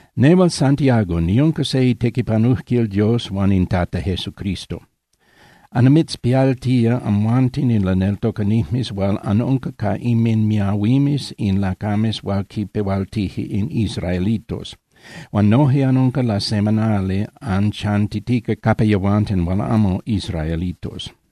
Nehual Santiago niunca se itequipanujquil Dios huan in Tata Jesucristo. Annimitzpialtía amhuanten in laneltocanijmes hual anunca ca inminmiahuimes in lacames hual quinpehualtije in israelitos. Huan noje anunca lasemanali anchantitica capa yehuanten hual amo israelitos.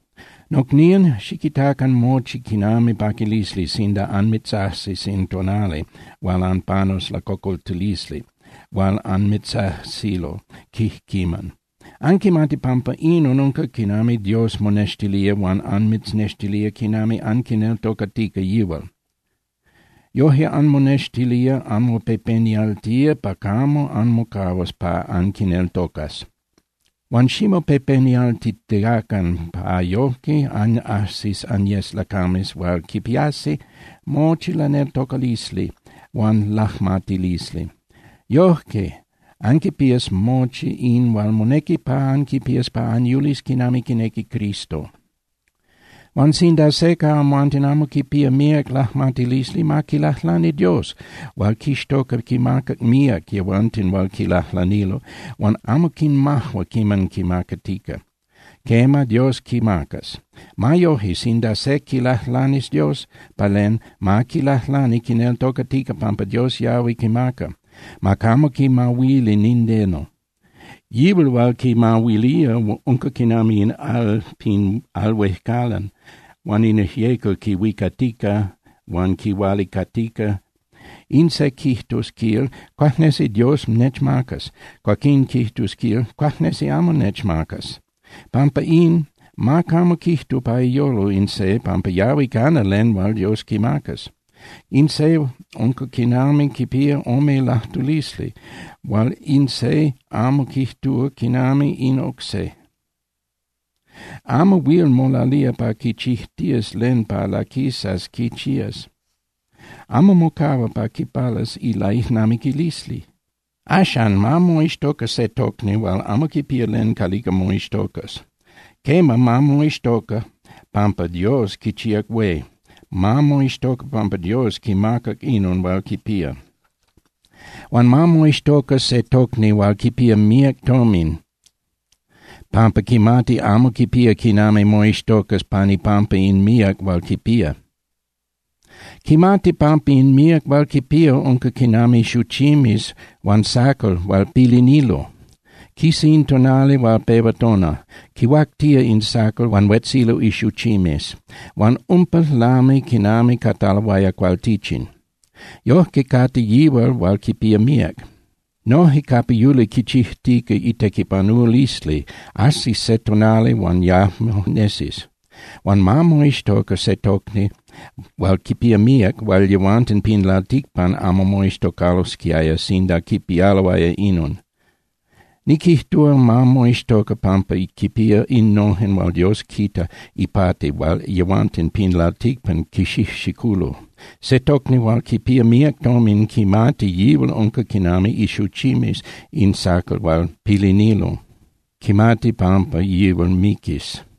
Nocnían, xiquitacan mochi quinami paquilisli sinda anmitzajsis in tonali hual anpanus lacocoltilisli hual anmitzajsilo quijquiman. Anquimati pampa inon unca quinami Dios monextilía huan anmitznextilía quinami anquineltocatica yihual. Yoje anmonextilía anmopepenialtía pa camo anmocahuas pa anquineltocas. Huan ximopepenialtitiacan pa yoje anajsis anyes lacames hual quipiasi mochi laneltocalisli huan lajmatilisli. Yoje anquipías mochi in hual monequi pa anquipías pa anyulis quinami quinequi Cristo. Huan sinda se ca amhuanten amo quipía míac lajmatilisli, ma quilajlani Dios hual quixtoca quimaca míac yehuanten hual quilajlanilo, huan amo quinmajua quiman quimacatica. Quema, Dios quimacas. Ma yoje, sinda se quilajlanis Dios pa len, ma quilajlani quineltocatica pampa Dios yahui quimaca. Ma camo quimahuili nindeno. Yihual hual quimahuilía unca quinami in al pin al huejcalan hual in ijyecal quihuicatica huan quihualicatica. In se quijtus, quil: “Cuajnesi Dios nechmacas”, cuaquín quijtus, quil: “Cuajnesi amo nechmacas.” Pampa in, ma camo quijtu pa iyolo in se pampa yahui cana len hual Dios quimacas. Quema, in se unca quinami quipía ome lajtulisli hual in se amo quijtúa quinami in oc se. Amo huil molalía pa quichijtías len pa laquisas quichías, amo mocahua pa quipalas ilaijnamiquilisli. Axan, ma moixtoca se tocni hual amo quipía len calica moixtocas. Quema, ma moixtoca pampa Dios quichíac hué, ma moixtoca pampa Dios quimacac inon hual quipía. Huan ma moixtoca se tocni hual quipía míac tomin pampa quimati amo quipía quinami moixtocas pan ipampa in míac hual quipía. Quimati pampa in míac hual quipía unca quinami xuchimes huan sacal hual pilinilo. Quisa in tonali huan pehua tona, quihuactía in sacal huan huetzilo ixuchimes, huan umpa lami quinami cataloaya cualtichin. Yojque cate yihual hual quipía míac. Noje capa yuli quichijtica itequipanulisli, ajsis se tonali huan yajmo nesis. Huan ma moixtoca se tocni hual quipía míac hual yehuanten pin lalticpan amo moixtocalosquiaya sinda quipialoaya inon. Niquijtúa, ma moixtoca pampa quipía innojen hual Dios quita ipati hual yehuanten pin lalticpan quixijxiculo. Se tocni hual quipía míac tomin quimati yihual unca quinami ixuchimes in sacal hual pilinilo, quimati pampa yihual miquis.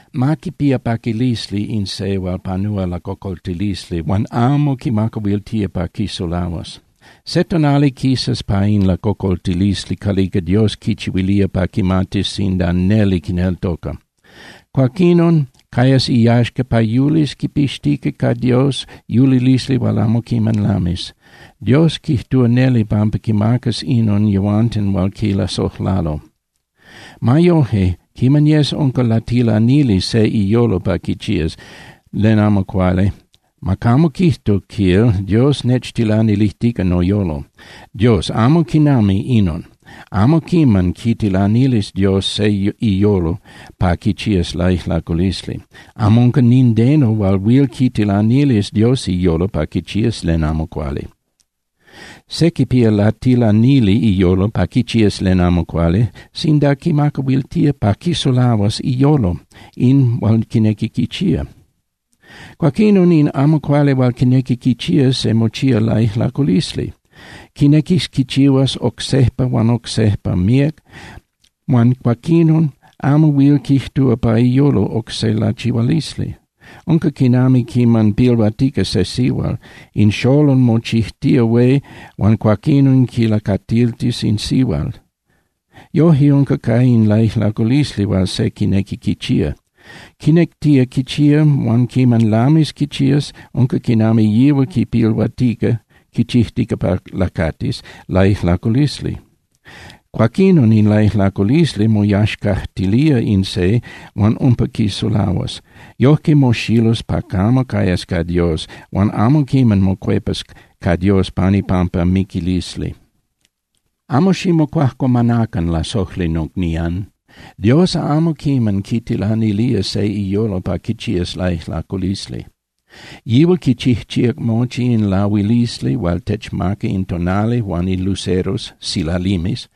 Ma quipía paquilisli in se hual panúa lacocoltilisli huan amo quimacahuiltía pa quisulahuas. Se tonali quisas pa in lacocoltilisli calica Dios quichihuilía pa quimatis sinda neli quineltoca. Cuaquinon cayas iyaxca pa yulis quipixtica ca Dios yulilisli hual amo quiman lamis. Dios quijtúa neli pampa quimacas inon yehuanten hual quilasojlalo. Ma yoje, quiman yes unca latilanili se iyolo pa quichías len amo cuali, ma camo quijtu, quil: “Dios nechtilanilijtica noyolo.” Dios amo quinami inon, amo quiman quitilanilis Dios se iyolo pa quichías laijlaculisli. Amo unca nindeno hual huil quitilanilis Dios iyolo pa quichías len amo cuali. Se quipía latilanili iyolo pa quichías len amo cuali sinda quimacahuiltía pa quisulahuas iyolo in hual quinequi quichía. Cuaquinon, in amo cuali hual quinequi quichía se mochía laijlaculisli. Quinequis quichihuas oc sejpa huan oc sejpa míac huan cuaquinon amo huil quijtúa pa iyolo oc se lachihualisli. Unca quinami quiman pilhuatica se sihual, in xolol mochijtía hué huan cuaquinon quilacatiltis in sihual. Yoje unca ca in laijlaculisli hual se quinequi quichía. Quinectía quichía huan quiman lamis quichías, unca quinami yihual quipilhuatica (quichijtica pa lacatis) laijlaculisli. Cuaquinon in laijlaculisli moyaxcajtilía in se huan umpa quisulahuas. Yojque moxilus pa camo cayas ca Dios huan amo quiman mocuepas ca Dios pan ipampa miquilisli. Amo ximocuajcuamanacan, lasojli nocnían. Dios amo quiman quitilanilía se iyolo pa quichías laijlaculisli. Yihual quichijchíac mochi in lahuilisli hual techmaca in tonali huan in luceros (silalimes)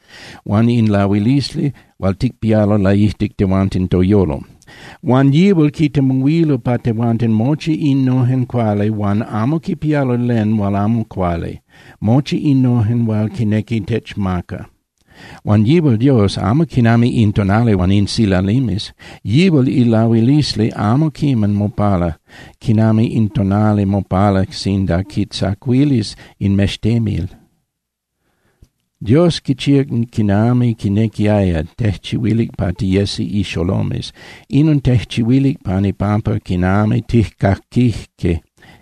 huan in lahuilisli hual ticpialo laijtic tehuanten toyolo. Huan yihual quitemuhuilo pa tehuanten mochi innojen cuali hual amo quipialo len hual amo cuali, mochi innojen hual quinequi techmaca. Huan yihual Dios amo quinami in tonali huan in silalimes. Yihual ilahuilisli amo quiman mopala quinami in tonali mopala sinda quitzacuilis in mextemil. Dios quichíac quinami quinequiaya, tejchihuilic pa tiyesi ixolomes. Inon tejchihuilic pan ipampa quinami tijcaquijque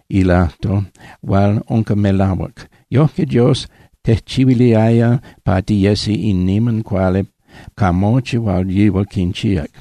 ilajtol hual unca melahuac. Yojque Dios tejchihuiliaya pa tiyesi in niman cuali ca mochi hual yihual quinchíac.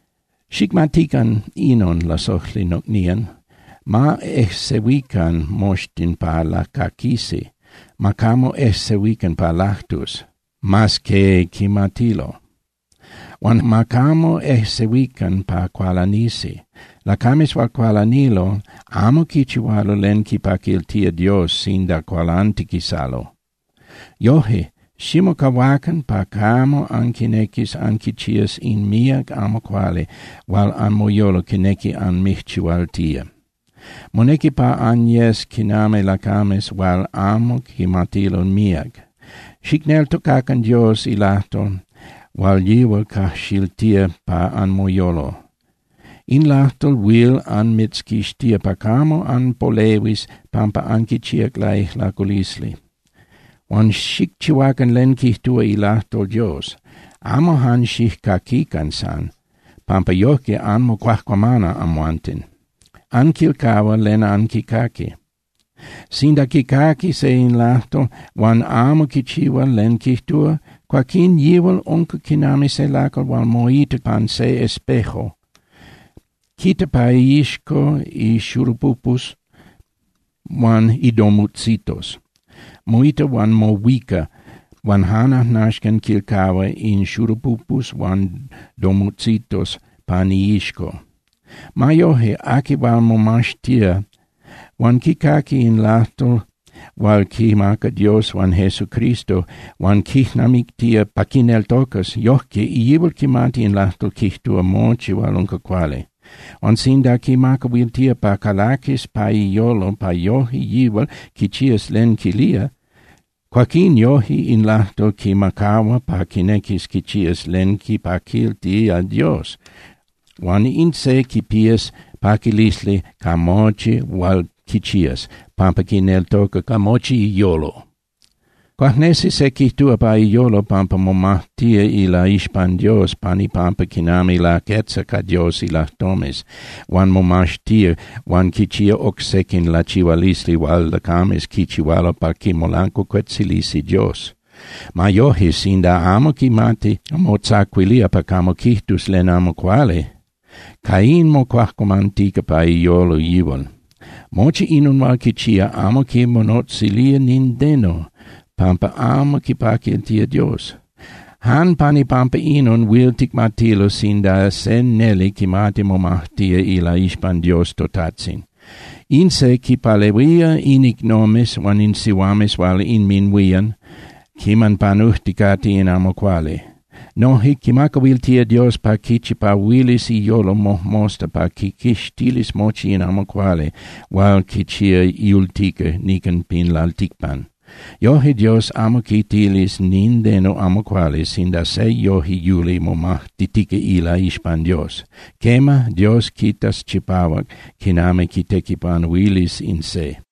Xicmatican inon, lasojli nocnían. Ma ejsehuican moxtin pa lacaquisi, ma camo ejsehuican pa lajtus, mas que quimatilo. Huan ma camo ejsehuican pa cualanisi. Lacames hual cualanilo amo quichihualo len quipaquiltilo Dios sinda cualantiquisalo. Yoje, ximocahuacan pa camo anquinequis anquichías in míac amo cuali hual anmoyolo quinequi anmijchihualtía. Monequi pa anyes quinami lacames hual amo quimatilo míac. Xicneltocacan Dios ilajtol hual yihual cajxiltía pa anmoyolo. In lajtol huil anmitzquixtía pa camo anpolehuis pampa anquichíac laijlaculisli. Huan xicchihuacan len quijtúa ilajtol Dios. Amo jan xijcaquican san, pampa yojque anmocuajcuamana amhuanten, anquilcahua len anquicaqui. Sinda quicaqui se in lajtol huan amo quichihua len quijtúa, cuaquín yihual unca quinami se lacal hual moita pan se espejo. Quita pa iixco ixurupupus huan idomutzitos. Moita huan mohuica, huan jan ajnaxcan quilcahua in xurupupus huan domutzitos pan iixco. Ma yoje, aqui hual momaxtía huan quicaqui in lajtol hual quimaca Dios huan Jesucristo huan quijnamictía pa quineltocas, yojque yihual quimati in lajtol quijtúa mochi hual unca cuali. Huan sinda quimacahuiltía pa calaquis pa iyolo pa yoje yihual quichías len quilía, cuaquín yoje in lajtol quimacahua pa quinequis quichías len quipaquiltía Dios. Huan in se quipías paquilisli ca mochi hual quichías, pampa quineltoca ca mochi iyolo. Cuajnesi se quijtúa pa iyolo pampa momajtía ilaixpan Dios pan ipampa quinami laquetza ca Dios ilajtomes huan momaxtía huan quichía oc sequin lachihualisli hual lacames quichihualo pa quimolancuacuetzilisi Dios. Ma yoje, sinda amo quimati motzacuilía pa camo quijtus len amo cuali, ca in mocuajcuamantica pa iyolo yihual. Mochi inon hual quichía amo quimonotzilía nindeno, pampa amo quipaquiltía Dios. Jan pan ipampa inon huil ticmatilo sinda se neli quimati momajtía ilaixpan Dios toTajtzin: In se quinpalehuía in icnomes huan in sihuames hual inminhuían quiman panujticate in amo cuali. Noje quimacahuiltía Dios pa quichipahuilis iyolo mojmosta pa quiquixtilis mochi in amo cuali hual quichía yultica nican pin lalticpan. Yoje Dios amo quitilis nindeno amo cuali sinda se yoje yuli momajtitica ilaixpan Dios. Quema, Dios quitas chipahuac quinami quitequipanuilis in se.